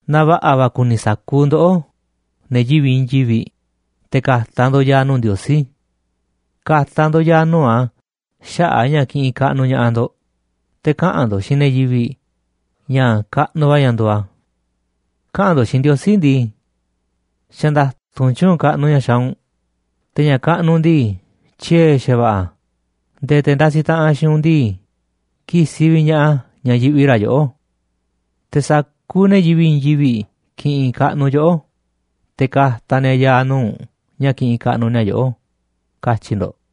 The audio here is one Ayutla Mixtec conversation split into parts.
Na va̱ꞌa̱ va̱ kuni sa̱kuuꞌ ndoꞌó, ne̱ yivi̱ꞌ i̱i̱n yivi̱ꞌ, te̱ ka̱ta̱ ndo̱ꞌ ya̱a̱ nuu̱ꞌ Ndiosí. Ka̱ta̱ ndo̱ꞌ ya̱a̱ nuu̱ꞌ a̱ xaꞌa̱ꞌ a̱ ña̱ kiꞌinꞌ kaꞌnuꞌ ña̱ꞌaꞌ ndo̱ꞌ, te̱ kaꞌa̱n ndo̱ꞌ xiinꞌ ne̱ yivi̱ꞌ ña̱ kaꞌnuꞌ va̱ ña̱ nduuꞌ a̱. Kaꞌa̱n ndo̱ꞌ xiinꞌ Ndiosí ndii: “Xa̱ nda̱tu̱nꞌ tyu̱u̱n kaꞌnuꞌ ña̱ xaaꞌ u̱nꞌ, te̱ ña̱ kaꞌnuꞌ u̱nꞌ ndii, tyiee̱ xa̱va̱ꞌa̱ a̱ nde̱e̱ te̱ ndasiꞌ taꞌanꞌ xiinꞌ u̱nꞌ ndii, ki̱si̱ vi̱ꞌ ña̱ꞌaꞌ a̱ ña̱ yiꞌvi ra̱ yoꞌó. Te̱ sa̱kuuꞌ ne̱ yivi̱ꞌ i̱i̱n yivi̱ꞌ ki̱ꞌi̱n kaꞌnu̱ yoꞌó, te̱ ka̱ta̱ ni̱a̱ ya̱a̱ nuu̱ꞌ u̱nꞌ ña̱ kiꞌinꞌ kaꞌnuꞌ ni̱a̱ yoꞌó”, katyi̱ ndo̱ꞌ.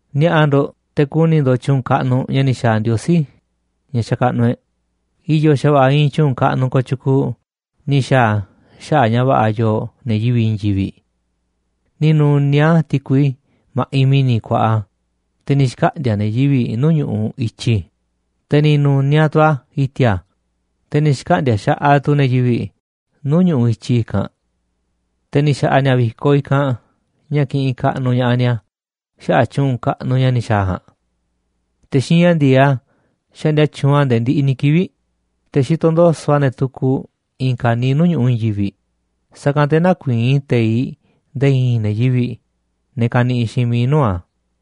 Ni̱a̱ꞌa̱ ndo̱ꞌ te̱ ku̱ni̱ ndo̱ꞌ tyu̱u̱n kaꞌnuꞌ ña̱ ni̱ xa̱a̱ Ndiosí, ña̱ xakaꞌnuꞌ e̱ꞌ, i̱yo̱ xa̱va̱ꞌa̱ iinꞌ tyu̱u̱n kaꞌnuꞌ kooꞌ tyukuuꞌ ni̱ xa̱a̱ a̱ xaꞌa̱ꞌ ña̱ va̱ꞌa̱ yooꞌ ne̱ yivi̱ꞌ i̱i̱n yivi̱ꞌ. Ni̱ nu̱niaꞌ a̱ ti̱kui ma̱ꞌiꞌ mi̱ni̱ kuaꞌa, te̱ ni̱ xkaꞌndi̱a̱ ne̱ yivi̱ꞌ nuu̱ꞌ ñu̱ꞌuꞌ i̱tyi, te̱ ni̱ nu̱niaꞌ tu̱ a̱ i̱ti̱a̱, te̱ ni̱ xkaꞌndi̱a̱ xaꞌaꞌ tu̱ ne̱ yivi̱ꞌ nuu̱ꞌ ñu̱ꞌuꞌ i̱tyi i̱kanꞌ. Te̱ ni̱ xa̱ꞌa̱ ni̱a̱ vi̱koꞌ i̱kanꞌ ña̱ kiꞌinꞌ kaꞌnuꞌ ña̱ꞌaꞌ ni̱a̱ xaꞌa̱ꞌ tyu̱u̱n kaꞌnuꞌ ña̱ ni̱ xa̱a̱ a̱ ja̱a̱nꞌ. Te̱ xiinꞌ ña̱ ndi̱e̱eꞌ a̱ xaꞌndia tyuunꞌ a̱ nde̱e̱ ndiꞌiꞌ ni̱ kivi̱ꞌ, te̱ xitoꞌ ndo̱so̱ꞌ a̱ ne̱ tukuꞌ i̱i̱n ka̱niiꞌ nuu̱ꞌ ñu̱ꞌuꞌ i̱i̱n yivi̱ꞌ, sa̱kanꞌ te̱ nä̱kuii̱n teiꞌ nde̱e̱ i̱i̱n ne̱ yivi̱ꞌ, ne̱ kaniꞌiꞌ xiinꞌ miiꞌ nuu̱ꞌ a̱.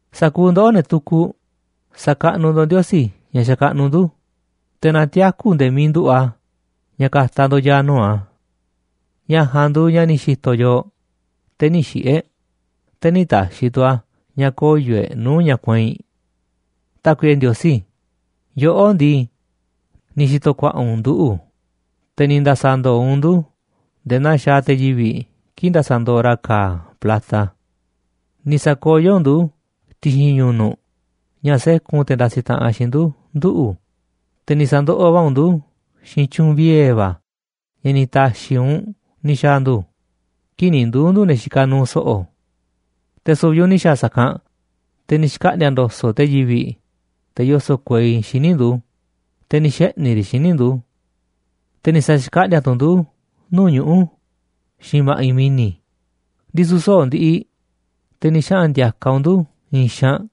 Sa̱kuuꞌ ndoꞌó, ne̱ tukuꞌ, sa̱kaꞌnuꞌ ndo̱ꞌ Ndiosí ña̱ xakaꞌnuꞌ ndu̱, te̱ na tiaku̱ nde̱e̱ miiꞌ nduꞌu̱ꞌ a̱ ña̱ ka̱ta̱ ndo̱ꞌ ya̱a̱ nuu̱ꞌ a̱. Ña̱ ja̱a̱nꞌ nduuꞌ ña̱ ni̱ xi̱to̱ yooꞌ, te̱ nï̱ xiꞌi̱ e̱ꞌ, te̱ nï̱ ta̱xi̱ tu̱ a̱ ña̱ koyo̱ e̱ꞌ nuu̱ꞌ ña̱ kueinꞌ. Tákuiꞌe Ndiosí, yoꞌó ndii, ni̱ xi̱to̱ ku̱a̱ꞌa̱ u̱nꞌ nduꞌu̱, te̱ ni̱ nda̱sa̱ ndo̱o̱ u̱nꞌ ndu̱ nde̱e̱ naa xaaꞌ te̱ yivi̱ꞌ kii̱ꞌ ndasaꞌ ndooꞌ ra̱ ka̱a̱ plata. Ni̱ sa̱koyó u̱nꞌ ndu̱ ti̱xi̱n ñu̱nu̱ꞌ ña̱ sékun te̱ ndasiꞌ taꞌanꞌ xiinꞌ ndu̱ nduꞌu̱, te̱ ni̱ sa̱ndoꞌoꞌ va̱ u̱nꞌ ndu̱ xiinꞌ tyu̱u̱n vie̱ va̱ ña̱ ni̱ ta̱xi̱ u̱nꞌ ni̱ xa̱a̱ ndu̱ kii̱ꞌ ni̱ nduu̱ ndu̱ ne̱ xikaꞌ nuuꞌ so̱ꞌo̱. Te̱ su̱vi̱ u̱nꞌ ni̱ xa̱a̱ sa̱kanꞌ, te̱ ni̱ xkaꞌndi̱a̱ ndo̱so̱ꞌ te̱ yivi̱ꞌ, te̱ yoso̱ꞌ kuei, xíniꞌ ndu̱, te̱ ni̱ xeꞌni̱ riꞌ xíniꞌ ndu̱. Te̱ ni̱ sa̱xkaꞌndíá tu̱ u̱nꞌ ndu̱ nuu̱ꞌ ñuꞌu̱ xiinꞌ ma̱ꞌiꞌ mi̱ni̱, ndisu̱ soꞌo̱ꞌ ndiꞌiꞌ, te̱ ni̱ xaꞌa̱n ndi̱a̱ka̱ u̱nꞌ ndu̱ i̱i̱n xaanꞌ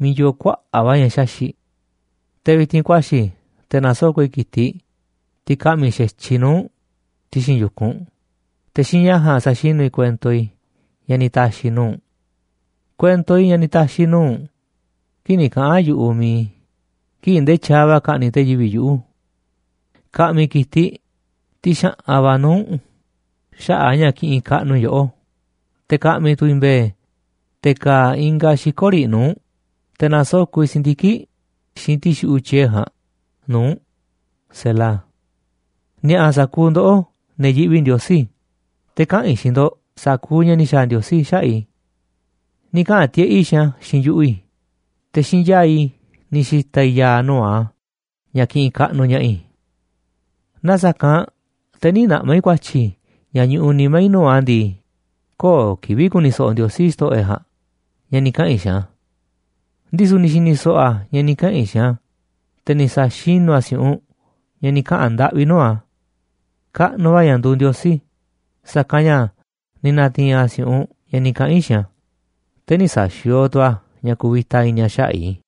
miiꞌ yoo kuaꞌa̱ꞌ va̱ ña̱ xaxi̱ꞌ. Te̱ vi̱ti̱n ku̱a̱xi̱ i̱ te̱ na̱soko̱ꞌ i̱ ki̱tiꞌ, tiꞌ ka̱ꞌmi̱ xa̱tyiꞌ i̱ nuu̱ꞌ u̱nꞌ, ti̱xi̱n yu̱kunꞌ u̱nꞌ, te̱ xiinꞌ ña̱ ja̱a̱nꞌ sa̱xinú i̱ kuento i̱ ña̱ ni̱ ta̱xi̱ i̱ nuu̱ꞌ u̱nꞌ, kuento i̱ ña̱ ni̱ ta̱xi̱ i̱ nuu̱ꞌ u̱nꞌ kii̱ꞌ ni̱ kaꞌa̱n yu̱ꞌuꞌ mi̱iꞌ i̱ kii̱ꞌ ndee tyaaꞌ va̱ ka̱ꞌni̱ꞌ te̱ yivi̱ꞌ yuꞌu̱. Ka̱ꞌmi̱ i̱ ki̱tiꞌ, tiꞌ xa̱ꞌan va̱, nuu̱ꞌ u̱nꞌ xaꞌa̱ꞌ a̱ ña̱ kiꞌinꞌ kaꞌnuꞌ i̱ yoꞌó, te̱ ka̱ꞌmi̱ tu̱ i̱ mbe̱e̱ te̱ ka̱a̱ ingaꞌ xiko̱ riꞌ nuu̱ꞌ u̱nꞌ, te̱ na̱soko̱ꞌ i̱ si̱ndiki̱ꞌ xiinꞌ ti̱xuꞌu̱ꞌ tyiee̱ ja̱a̱nꞌ nuu̱ꞌ u̱nꞌ. Ni̱a̱ꞌa̱ sa̱kuuꞌ ndoꞌó, ne̱ yiꞌvi Ndiosí, te̱ kaꞌa̱n i̱ xiinꞌ ndo̱ꞌ sa̱kuuꞌ ña̱ ni̱ xa̱a̱ Ndiosí xaꞌa̱ꞌ i̱. Ni̱ kaꞌa̱n tiꞌeꞌ i̱ xiinꞌ a̱ xiinꞌ yu̱ꞌuꞌ i̱, te̱ xiinꞌ yaa̱ꞌ i̱ ni̱ xi̱ta̱ i̱ ya̱a̱ nuu̱ꞌ a̱ ña̱ kiꞌinꞌ kaꞌnuꞌ ña̱ꞌaꞌ i̱. Naaꞌ sa̱kanꞌ te̱ nï̱ naꞌma̱ i̱ ku̱a̱tyi̱ ña̱ ñuꞌuꞌ nimá i̱ nuu̱ꞌ a̱ ndii, köo̱ꞌ kivi̱ꞌ ku̱ni̱ so̱ꞌo̱ Ndiosí, xto̱ꞌo̱ e̱ꞌ ja̱a̱nꞌ, ña̱ ni̱ kaꞌa̱n i̱ xiinꞌ a̱. Ndisu̱ ni̱ xi̱ni̱ so̱ꞌo̱ a̱ ña̱ ni̱ kaꞌa̱n i̱ xiinꞌ a̱, te̱ ni̱ sa̱xinú a̱ si̱u̱ꞌunꞌ ña̱ ni̱ kaꞌa̱n ndaꞌvi i̱ nuu̱ꞌ a̱. Kaꞌnuꞌ va̱ ña̱ nduuꞌ Ndiosí, sa̱kanꞌ ña̱ ni̱ na̱ti̱i̱n a̱ si̱u̱ꞌunꞌ ña̱ ni̱ kaꞌa̱n i̱ xiinꞌ a̱, te̱ nï̱ sa̱xi̱o̱o̱ tu̱ a̱ ña̱ kuvita i̱ni̱ a̱ xaꞌa̱ꞌ i̱.